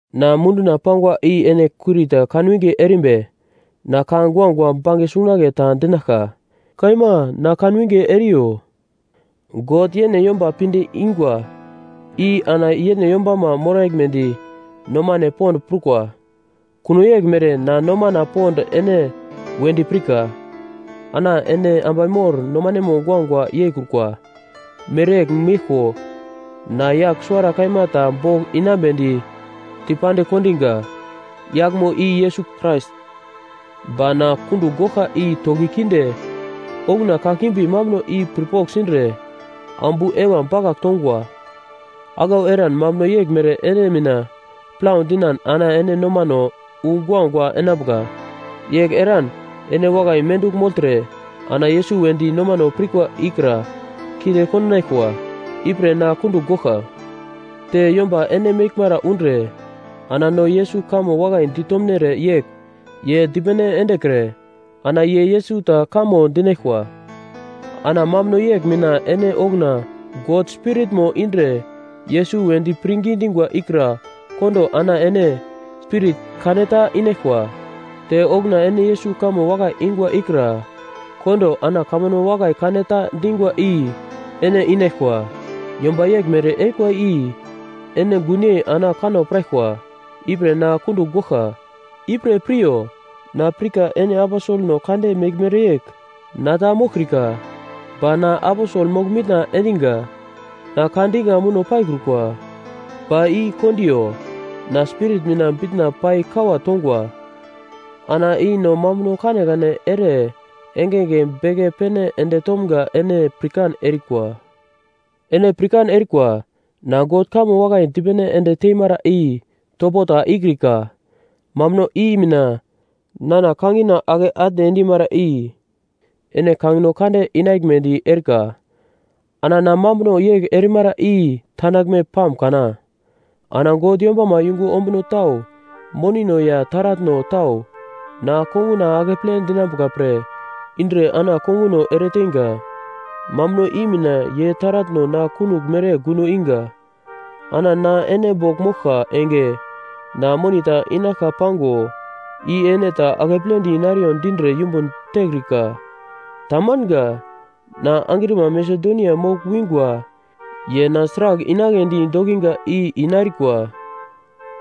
Na munduna pangwa i ene kurita kanwinge erimbi na ka guagua bange sungunagle ta dinaglka. Kaima na kanwinge eriyo. God yene yomba pinde ingwa i ana yene yombama moraglmedi nomane pond prukwa. Kuno yeglmere na nomana pond ene wedi pirka. Ana ene ambai mor nomanemo guagua yeikrukwa mereyegl meglko na yagl suwara kaima ta bogl inambedi dipandigl kondiga, yaglmo i Yesus Krais. Ba na kundugl goglka i toki kinde okuna kakimbi mambuno i pirpogl sindre ambu Eva bakagl tongwa. Aglau eran mambuno yeglmere ene mina plau dinan ana ene nomano wu guagua enambuka. Yegl eran ene wakai mendugl mogltre ana Yesus wedi nomano pirkwa ikra kinde kondinaglkwa. Ipre na kundugl goglka. Te yomba ene meglmara undre ana no Yesus kamo wakai ditomnere yegl ye dipene endekre ana ye Yesus ta kamo dinaglkwa. Ana mambuno yegl mina ene okuna God Spiritmo indre Yesus wedi pirngi dingwa ikra kondo ana ene spirit kaneta inaglkwa. Te okuna ene Yesus kamo wakai ingwa ikra kondo ana kamambuno wakai kane ta dingwa i ene inaglkwa. Yomba yeglmere erikwa i ene gunyei ana kanno piraglkwa. Ipre na kundugl goglka. Ipre piryo! Na pirka ene aposelno kande meglmere yegl na ta moglkrika. Ba na aposel mogl-mitna endinga. Na ka dinga muno paikrukwa, ba i kondiyo. Na spirit mina bitna pai kawa tongwa. Ana i no mambuno kanekane ere engenge beke pene ende tomgo ene pirkan erikwa. Ene pirkan erikwa, na God kamo wakai dipene ende teimara i topo ta ikrika. Mambuno i mina nana kangina ake atne endimara i ene kangino kande inaglmedi erika. Ana na mambuno yegl erimara i tandaglme pam kana? Ana God yombama yungu ombuno tau monino ya taratno tau na konguna akeple dinambuka pre indre ana ene konguno ereteinga. Mambuno i mina ye taratno na kunogl mere gundo iga. Ana na ene bogl moglka enge na moni ta inaglka pango, i ene ta akepledi nariyo dindre yumbun tekrika. Tamanga. Na angrima Masedonia mogl wingwa ye na sragl inagledi dokiga i inarikwa.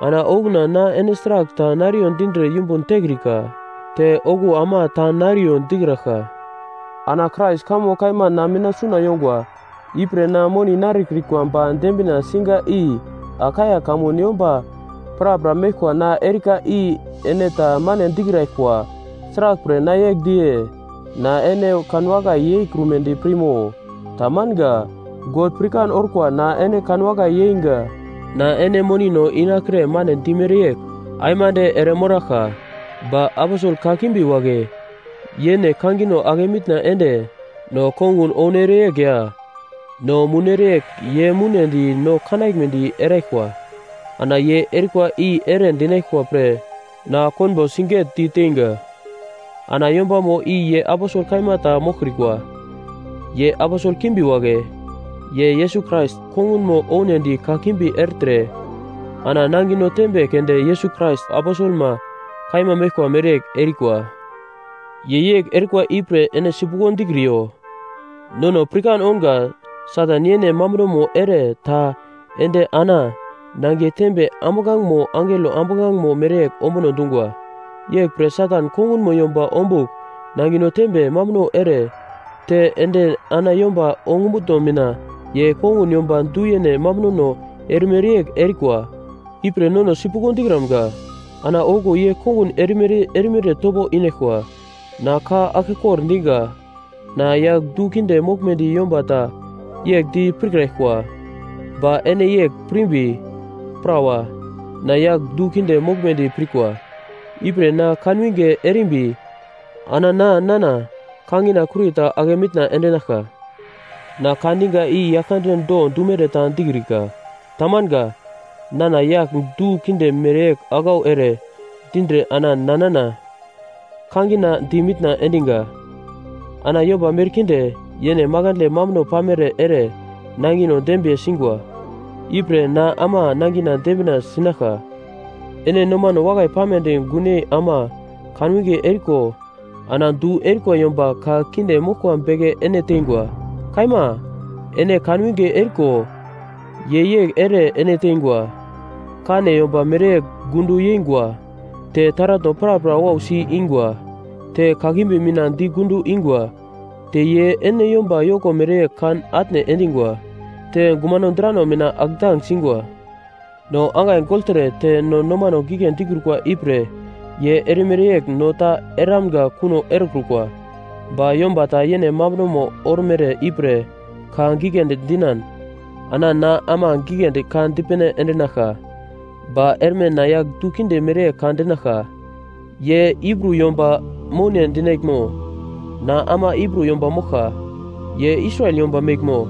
Ana okuna na ene sragl ta nariyo dindre yumbun tekrika, te okuwo ama ta nariyo dikraglka. Ana Krais kamo kaima na mina suna yongwa. Ipre na moni narikrikwa ba dembina siga i Akaia kamun yomba prapra meglkwa na erika i ene ta mane dikraglkwa. Sraglpre na yegl diye? Na ene kanwakai yeikrumedi pirmo? Tamanga. God pirkan orkwa na ene kanwakai yeingwa. Na ene monino inakre mane dimere yegl aimande ere moraglka. Ba “aposel kakimbi” wagle yene kangino ake mitna ende no kongun ounere yegl ya no mounere yegl ye mounedi no kanaglmedi eraglkwa. Ana ye erikwa i ere dinaglkwa pre na konbo sigetdi teinga. Ana yombamo i ye aposel kaima ta moglkrikwa. Ye aposel kakimbi wagle, ye Yesus Krais kongunmo ounedi kakimbi ertre ana nangino tembe keunde Yesus Krais aposelma kaima meglkwa mereyegl erikwa. Ye yegl erikwa ipre ene sipuglo dikriyo. Nono pirkan ounga Satan yene mambunomo ere ta ende ana nangiye tembe ambuglangemo angelo ambuglangemo mereyegl ombuno dungwa. Yeglpre Satan kongunmo yomba ombugl nangino tembe mambuno ere ta ende ana yomba ongumutno mina ye kongun yomba du-yene mambunono erimere yegl erikwa. Ipre nono sipuglo dikramga. Ana okuwo ye kongun erimere erimere topo inaglkwa. Na ka aglkekor dinga, na yagl du kinde moglumedi yomba ta yegl di pirkraglkwa. Ba ene yegl pirimbi, prawa, na yagl du kinde moglmedi pirkwa. Ipre na kanwinge erimbi ana na nana kangina kurita ake mitna endinaglka. Na ka diga i Yaglkande do dumere ta dikrika. Tamanga. Nana yagl du kinde mereyegl aglau ere dindre ana nana kangina di mitna endiga. Ana yomba merkinde, yene makandle mambuno pamere ere nangino dembiye singwa, ipre na ama nangina dembina sinaglka. Ene nomano wakai pamedi gunyei ama kanwinge eriko ana du erikwa yomba ka kinde moglkwa beke ene tengwa! Kaima. Ene kanwinge eriko ye yegl ere ene teingwa; kane yomba mereyegl gundo yengwa, te taratno prapra wausi ingwa, te kakimbi mina di gundo ingwa, te ye ene yomba yoko mereyegl kan atne endingwa, te gumano drano mina atndang singwa. No angai gogltre te no nomano gigle dikrukwa ipre ye erimere yegl no ta eramga kuno erekrukwa. Ba yomba ta yene mambuno ormere ipre ka giglendi dinan, ana na ama giglendi ka dipene endinaglka. Ba erme na yagl du kinde mereyegl ka dinaglka. Ye Hibru yomba moune dinaglmo? Na ama Hibru yomba moglka. Ye Israel yomba meglmo?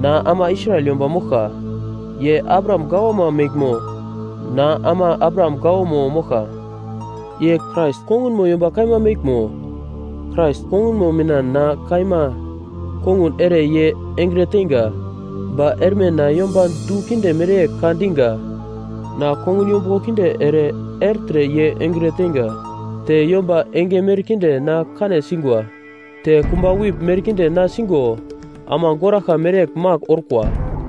Na ama Israel yomba moglka. Ye Abraham gawama meglmo? Na ama Abraham gawamo moglka. Ye Krais kongunmo yomba kaima meglmo? Krais kongunmo mina na kaima kongun ere ye engre teinga. (Ba erme na yomba du kinde mereyegl ka dinga.) Na kongun yombuglo kinde ere ertre ye engre teinga. Te yomba enge merkinde na kane singwa, te kumba wip merkinde na sigo ama goraglka mereyegl magl orkwa.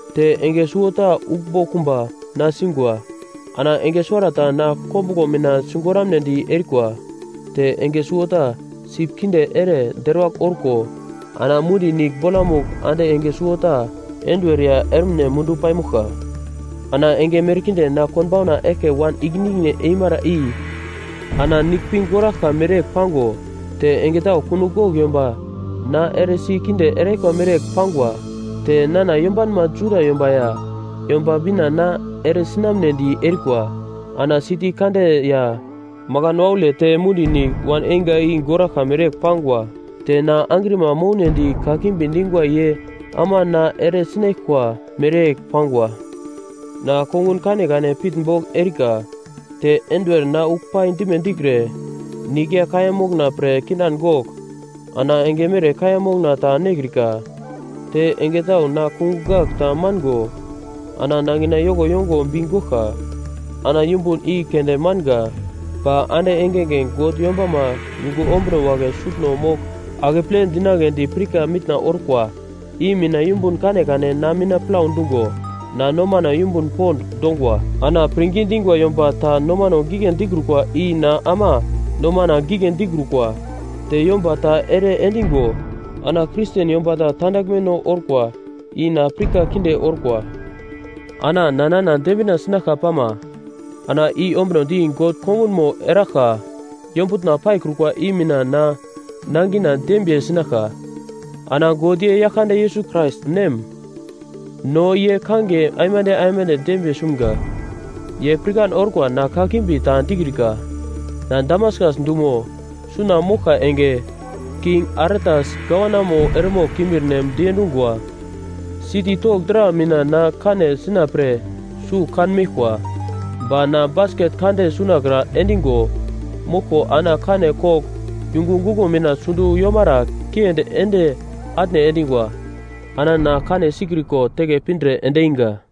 Te enge suwota uglmbo kumba na singwa, ana enge suwarata na kombuglo mina sigoramnedi erikwa. Te enge suwota sip kinde ere deruwagl orko ana mundi nigl bolamugl ande enge suwarata enduwer ya ermine mundu paimoglka. Ana enge merkinde na konbauna eglke wan ikine ikine eimara i ana nigl pi goraglka mereyegl pango, te enge tau kunogl gogl yomba na eresi kinde eraglkwa mereyegl pangwa. Te nana yombanma Juda yomba ya Yomba Bina na eresinamnedi erikwa. Ana siti kande ya makan waule te mundi nigl wan einga i goraglka mereyegl pangwa. Te na angrima mounedi kakimbi dingwa ye ama na eresinaglkwa mereyegl pangwa. Na kongun kanekane pitnbogl erika. Te enduwer na uglpai dime dikre, nigl ya kaiya mokna pre kindan gogl ana enge mere kaiya mokna ta nekrika. Te enge tau na kungugl gagl ta mango ana nangina yoko yongo bi goglka. Ana yumbun i keunde manga ba ande engenge God yombama yungu ombuno wagle sutno mogl akeple dinagledi pirka mitna orkwa i mina yumbun kanekane na mina plau dungo na nomana yumbun pond dongwa. Ana pirngi dingwa yomba ta nomano gigle dikrukwa i na ama nomana gigle dikrukwa; te yomba ta ere endigo ana Kristen yomba ta tandaglmeno orkwa, i na pirka kinde orkwa. Na nana dembina sinaglka pama, ana i ombunodi God kongunmo eraglka yombutna paikrukwa i mina na nangina dembiye sinaglka. Ana God ye Yaglkande Yesus Krais Nem, no ye kangiye aimande aimande dembiye sumga! Ye pirkan orkwa na kakimbi ta dikrika. Na Damaskas dumo suna moglka enge, King Aretas gavanamo eremogl kimbirnem diendungwa siti togl dra mina na kane sina pre sugl kan meglkwa. Ba na basket kande sunakra endingo moglko ana kane kogl yungu guglo mina sundo yomara kiendi ende atne endingwa. Ana na kane sikriko teke pindre endinga.